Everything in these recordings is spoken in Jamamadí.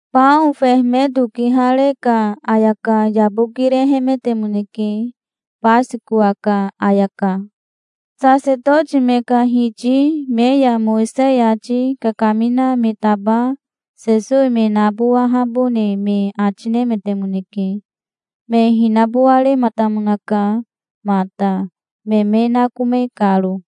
Bao fehemeto kihare ka ayaka yabokirehemetemoneke, Basikowa ka ayaka. Sasetoti me ka hiti me ya Mowisei ati kakamina me taba Sesowi me nabowahabone me ati nemetemoneke. Me hinabowarematamonaka mata, me me nakome karo.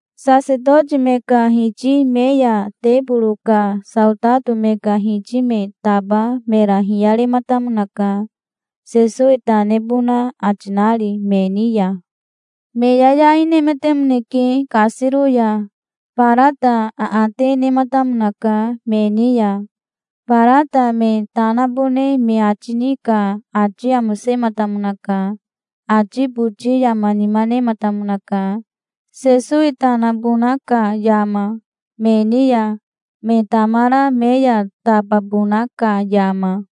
Sasetoti me ka hiti me ya teboro ka saotato me ka hiti me taba mera hiyarematamonaka, Sesowi ta nebona ati nari me ni ya. Me yayai nemetemoneke kasiro ya. Barata aate nematamonaka me ni ya. Barata me ta nabone me ati ni ka ati amosematamonaka. Ati boti yama nima nematamonaka, Sesowi ta nabona ka yama, me ni ya, me tamara me ya tababona ka yama.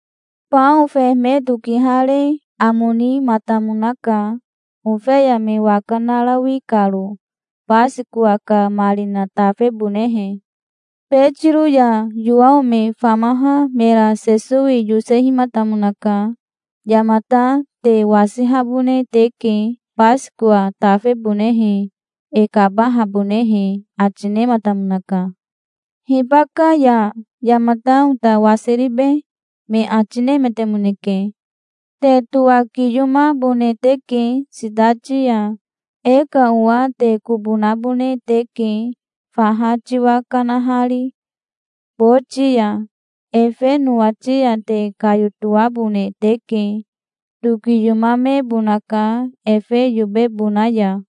Bao fehemeto kihare amo nimatamonaka, ofeya me waka narawi karo, Basikowa ka marina tafebonehe. Betiro ya Yowao me famaha mera Sesowi yosehimatamonaka. "Yamata te wasihabone teke Basikowa tafebonehe, e kabahabonehe", ati nematamonaka. "Hibaka ya yamata ota wasiribe?" me ati nemetemoneke. "Te towakiyomabone teke sitati ya. E ka owa te kobo nabone teke, faha tiwa kanahari boti ya. Efe nowati ya te kayotoabone teke. Tokiyomamebonaka efe yobebona ya.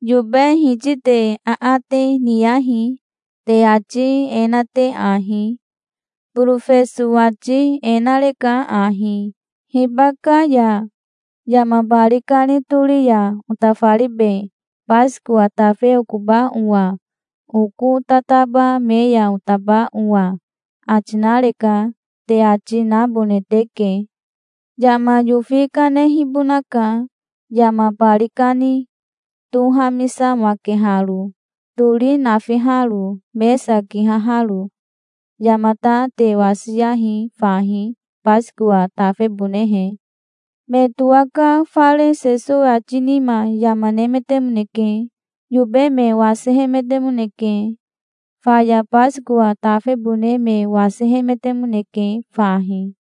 Yobe hiti te aate niyahi, te ati e na te ahi: 'Borofeso ati e nareka ahi: "Hibaka ya yama bari kani tori ya otafaribe Basikowa tafe okoba owa, oko tataba me ya otaba owa?" ati nareka', te ati nabone teke. Yama yofi kanehibonaka, yama bari kani tohamisamakeharo, tori nafiharo, mesa kihaharo. Yamata te wasiyahi fahi, Basikowa tafebonehe". Me towaka fare Sesowi ati nima yama nemetemoneke. Yobe me wasihemetemoneke. Faya Basikowa tafebone me wasihemetemoneke fahi.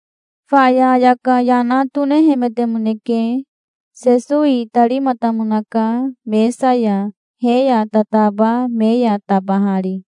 Faya ayaka yana tonehemetemoneke. Sesowi itarimatamonaka mesa ya, he ya tataba me ya tabahari.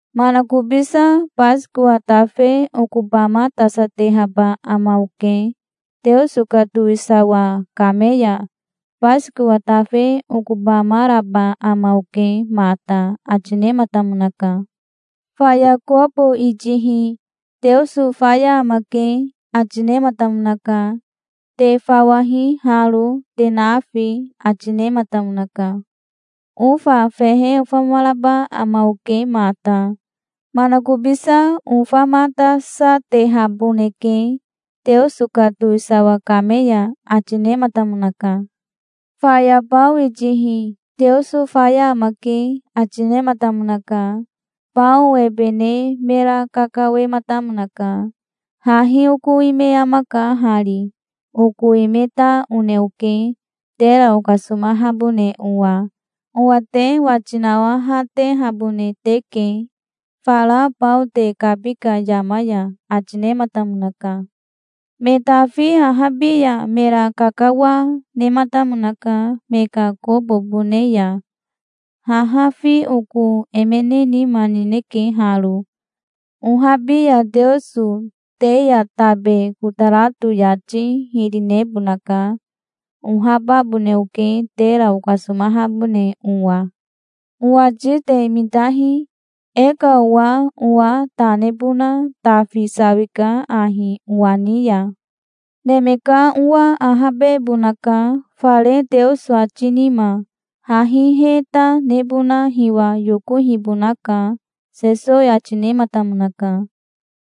Manakobisa Basikowa tafe okobamatasatehaba ama oke, Teoso ka towisawa kame ya. Basikowa tafe okobamaraba ama oke mata", ati nematamonaka. Faya kobo itihi "Teoso faya amake", ati nematamonaka. "Te fawahi haro, te nafi", ati nematamonaka. "Ofa fehe ofamaraba ama oke mata. Manakobisa ofamatasatehaboneke Teoso ka towisawa kame ya", ati nematamonaka. Faya bao itihi "Teoso faya amake", ati nematamonaka. Bao ebe ne mera kakawematamonaka. "Hahi oko ime amaka hari. Oko ime ta one oke, tera okasomahabone owa. Owa te wati nawahatehabone teke, fara bao te kabi ka yama ya", ati nematamonaka. Me tafi ahabi ya mera kakawa nematamonaka me ka kobobone ya. "Haha fi oko emene nima nineke haro. Ohabi ya Teoso te ya tabe kotarato yati hiri nebonaka. Ohababone oke, tera okasomahabone owa. Owati te mitahi. E ka owa owa ta nebona tafi sawika ahi owa ni ya. Neme ka Owa ahabebonaka fare Teoso ati nima. Hahi he ta nebona hiwa yokohibonaka", Sesowi ati nematamonaka.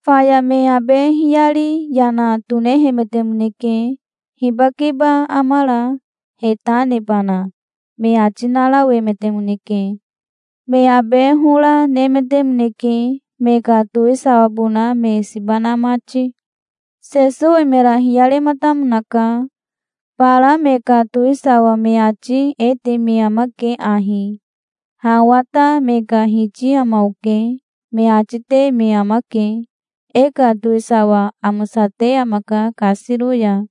Faya me abe hiyari yana tonehemetemoneke. "Hibakeba amara, he ta nebana?" me ati narawemetemoneke. Me abe hora, nemetemoneke, me ka towisawabona me siba na mati. Sesowi mera hiyarematamonaka. "Bara me ka towisawa me ati e te me amake ahi: 'Ha owa ta me ka hiti ama oke', me ati te me amake. 'E ka towisawa amosate amaka kasiro ya',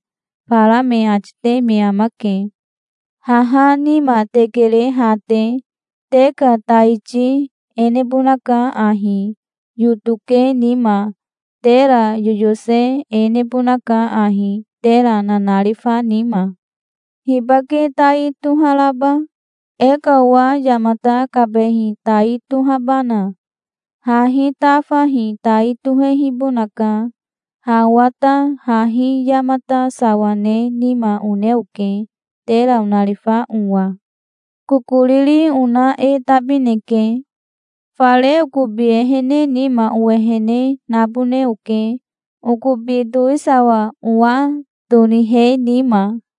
bara me ati te me amake. Haha nima te kere ha te. Te ka taiti e nebonaka ahi, yoto ke nima. Tera yoyose e nebonaka ahi, tera nanarifa nima. Hibake tai toharaba? E ka owa yamata kabehi tai tohabana? Hahi tafahi tai tohehibonaka. Ha owa ta hahi yamata sawa ne nima one oke, tera onarifa owa. Kokoriri ona e tabineke. Fare okobi ehene nima owehene nabone oke, okobi towisawa owa tonihe nima.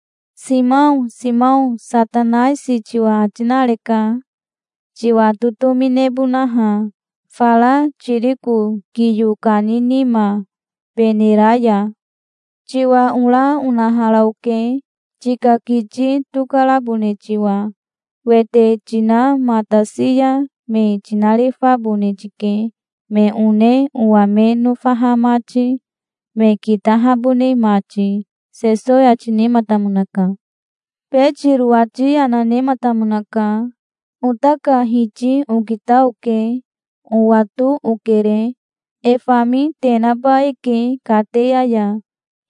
"Simao, Simao, Satanaisi tiwa ati nareka, tiwa totomi nebonaha, fara tiriko kiyo kani nima, benera ya. Tiwa ora onahara oke, tika kiti tokarabone tiwa. Wete tinamatasi ya me tinarifabone tike, me one owa me nofaha mati, me kitahabone mati", Sesowi ati nematamonaka. Betiro ati yana nematamonaka. "Ota ka Hiti okita oke. Owato okere. E fami te naba eke kateya ya.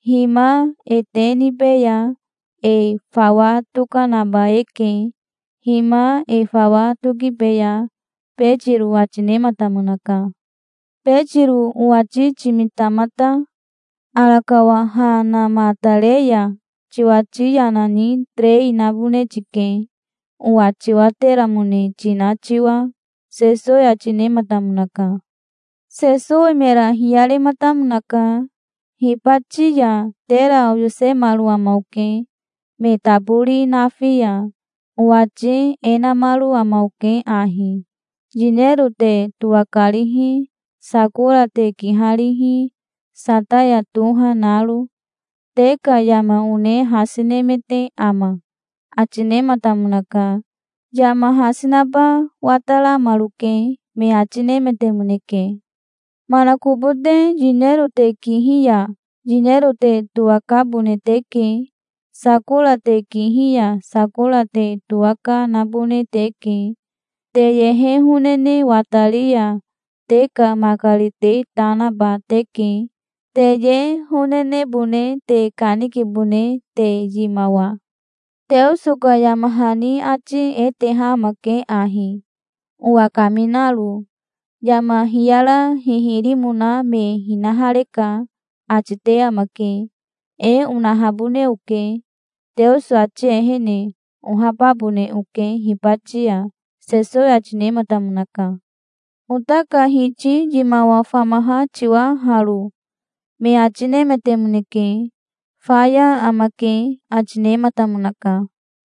Hima e te nibeya. E fawa tokanaba eke. Hima e fawa tokibeya", Betiro ati nematamonaka. "Betiro owati timita mata. Arakawa ha namatare ya tiwati yana ni terei nabone tike, owa tiwateramone tina tiwa", Sesowi ati nematamonaka. Sesowi mera hiyarematamonaka. "Hibati ya tera oyosemaro ama oke, me tabori nafi ya. Owati e namaro ama oke ahi: Yinero te towakarihi, sakora te kiharihi, sataya toha naro. Te ka yama one hasi nemete ama?" ati nematamonaka. "Yama hasi naba wataramaroke", me ati nemetemoneke. "Manakobote yinero te kihi ya yinero te towakabone teke. Sakora te kihi ya sakora te towaka nabone teke. Te ye honene watari ya te ka makari te ta naba teke, te ye honenebone te kanikabone te, yimawa. Teoso ka yama hani ati e teha amake ahi, owa kaminaro: 'Yama hiyara hihirimona me hinahareka', ati te amake. E onahabone oke Teoso ati ehene. Ohababone oke hibati ya", Sesowi ati nematamonaka. "Ota ka Hiti yimawa famaha tiwa haro", me ati nemetemoneke. "Faya amake", ati nematamonaka.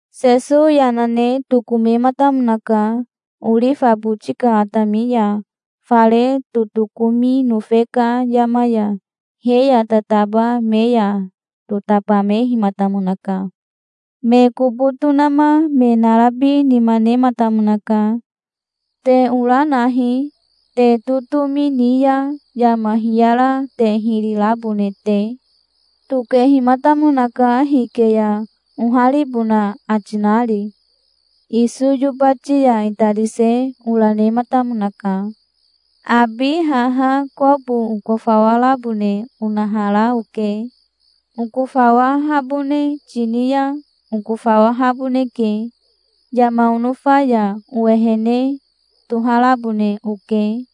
Sesowi yana ne tokomematamonaka orifa boti ka atami ya, fare totokomi nofe ka yama ya. He ya tataba me ya totabamehimatamonaka. Me kobo tonama me narabi nima nematamonaka. "Te ora nahi, te totomi ni ya yama hiyara te hiri rabone te". Tokehimatamonaka hike ya, oharibona ati nari. Iso yobati ya itarise ora nematamonaka. "Abi haha kobo okofawarabone onahara oke. Okofawahabone tini ya okofawahaboneke. Yama onofa ya owehene toharabone oke.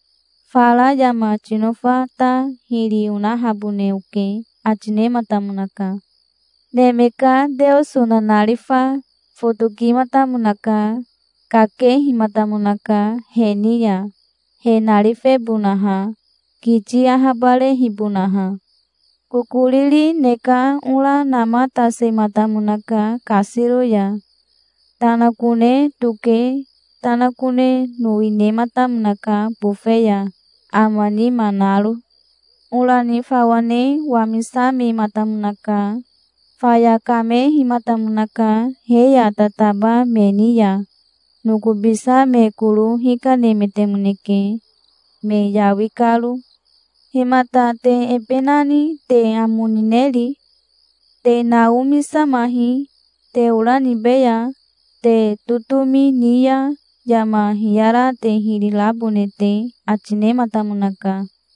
Fara yama tinofa ta hiri onahabone oke", ati nematamonaka. Neme ka Teoso nanarifa fotokimatamonaka. Kakehimatamonaka he ni ya, he narifebonaha, kiti ahabarehibonaha. Kokoriri ne ka ora namatasematamonaka kasiro ya. Tanakone toke tanakone nowi nematamonaka bofe ya, ama nima naro. Ora ni fawa ne wamisamematamonaka. Faya kamehimatamonaka he ya tataba me ni ya. Nokobisa me koro hikanemetemoneke, me yawi karo. "Himata te ebe nani te amo nineri? Te naomisamahi, te ora nibeya, te totomi ni ya yama hiyara te hiri rabone te", ati nematamonaka.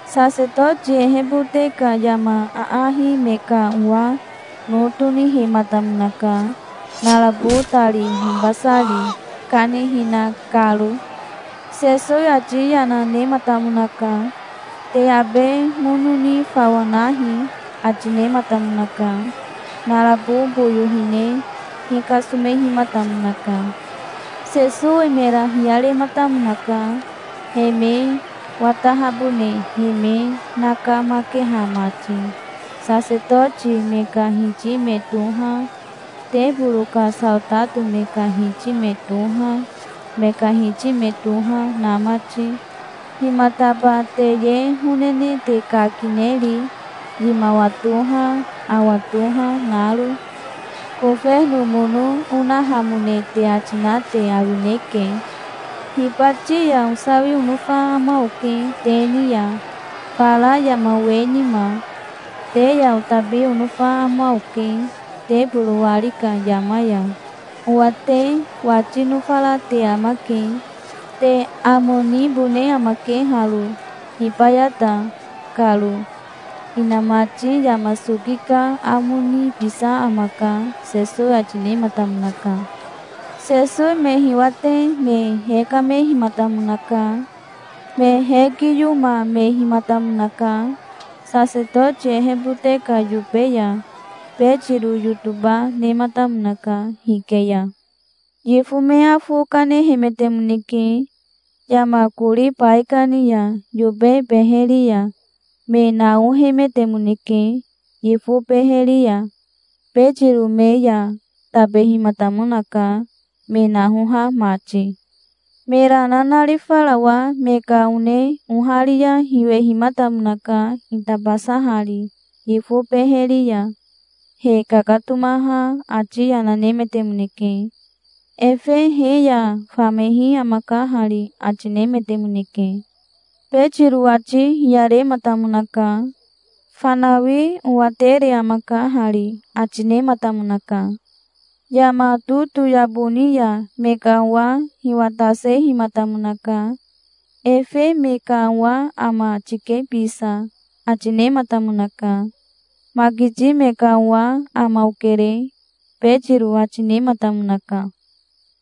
Sasetoti ehebote ka yama aahi me ka owa no tonihematamonaka, narabo tari hibasari, kanihina karo. Sesowi ati yana nematamonaka. "Te abe mono ni fawa nahi", ati nematamonaka. Narabo boyo hine hikasomehimatamonaka. Sesowi mera hiyarematamonaka, he me watahabone he me nakamakeha mati, sasetoti me ka hiti me toha, teboro ka saotato me ka hiti me toha, me ka hiti me toha na mati. "Himataba te ye honene te kakineri, yimawa toha, awa toha naro? Kofeno mono onahamone te ati na te awineke. Hibati ya osawi onofa ama oke te ni ya, fara yama we nima. Te ya otabi onofa ama oke teboro wari ka yama ya. Owa te wati nofara te amake. Te amo nibone amake haro, hibayata karo. Inamati yama soki ka amo nibisa amaka", Sesowi ati nematamonaka. Sesowi me hiwate me hekamehimatamonaka. Me hekiyomamehimatamonaka sasetoti ehebote ka yobe ya. Betiro yotoba nematamonaka hike ya. Yifo me afo kanehemetemoneke yama kori baikani ya, yobe beheri ya. Me naohemetemoneke yifo beheri ya. Betiro me ya tabehimatamonaka, me nahoha mati. Mera nanarifarawa me ka one oharia hiwehimatamonaka itabasahari yifo beheri ya. He kakatomaha ati yana nemetemoneke. "Efe he ya famehi amaka hari", ati nemetemoneke. Betiro ati hiyarematamonaka. "Fanawi owatere amaka hari", ati nematamonaka. Yama totoyabo ni ya me ka owa hiwatasehimatamonaka. "Efe me ka owa ama tike bisa", ati nematamonaka. "Makiti me ka owa ama okere", Betiro ati nematamonaka.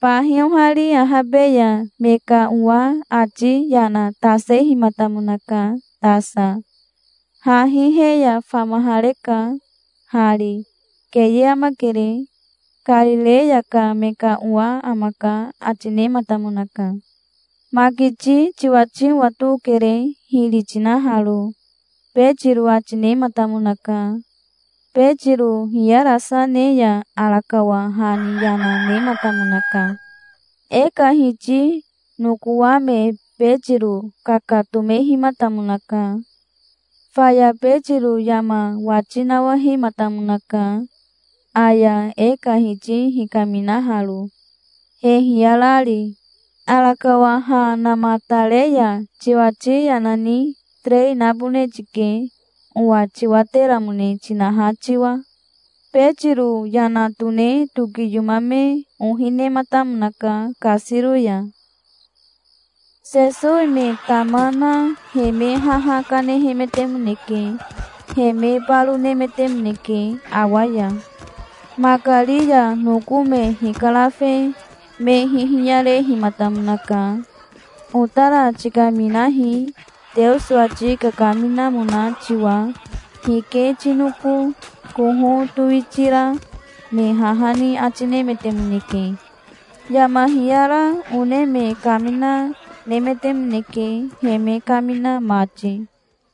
Bahi ohari ahabe ya me ka owa ati yana tasehimatamonaka tasa. "Hahi he ya famahareka hari. Keye amakere. Karireya ka me ka owa amaka", ati nematamonaka. "Makiti tiwati owato okere, hiri tinaharo", Betiro ati nematamonaka. Betiro hiyarasa ne ya arakawa ha ni yana nematamonaka. E ka Hiti nokowame Betiro kakatomehimatamonaka. Faya Betiro yama wati nawahematamonaka, aya e ka Hiti hikaminaharo, he hiyarari. "Arakawa ha namatare ya tiwati yana ni terei nabone tike, owa tiwateramone tinaha tiwa". Betiro yana tone tokiyomame ohi nematamonaka kasiro ya. Sesowi me tama na he me haha kanehemetemoneke. He me baro nemetemoneke awa ya. Makari ya noko me hikarafe me hihiyarehimatamonaka. "Otara tikaminahi, Teoso ati kakaminamona tiwa. Hike tinoko koho towitira?", me haha ni ati nemetemoneke. Yama hiyara one me kamina nemetemoneke, he me kamina mati.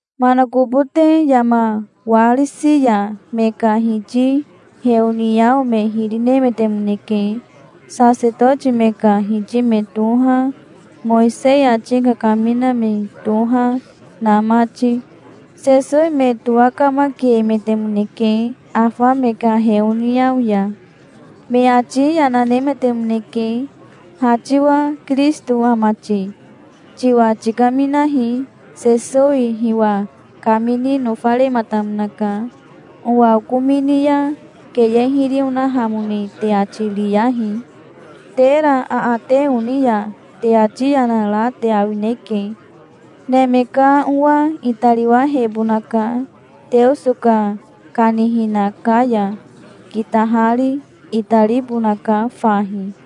Manakobote yama warisi ya me ka hiti heoniao me hiri nemetemoneke, sasetoti me ka hiti me toha, Mowisei ati kakamina me toha na mati. Sesowi me towakamakiemetemoneke afa me ka heoniao ya. Me ati yana nemetemoneke. "Ha tiwa Kirisito ama ti? Tiwa tikaminahi". Sesowi hiwa kamini nofarematamonaka. "Owa okomini ya keye hiri onahamone te ati riyahi. Tera aate oni ya te ati yana ra te awineke. Neme ka Owa itariwahebonaka Teoso ka kanihina ka ya, kitahari. Itaribonaka fahi".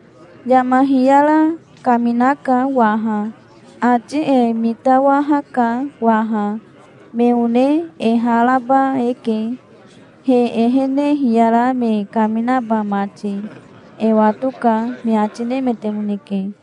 "Yama hiyara kaminaka waha. Ati e mitawahaka waha. Me one e ha raba eke, he ehene hiyara me kaminaba mati. E watoka", me ati nemetemoneke.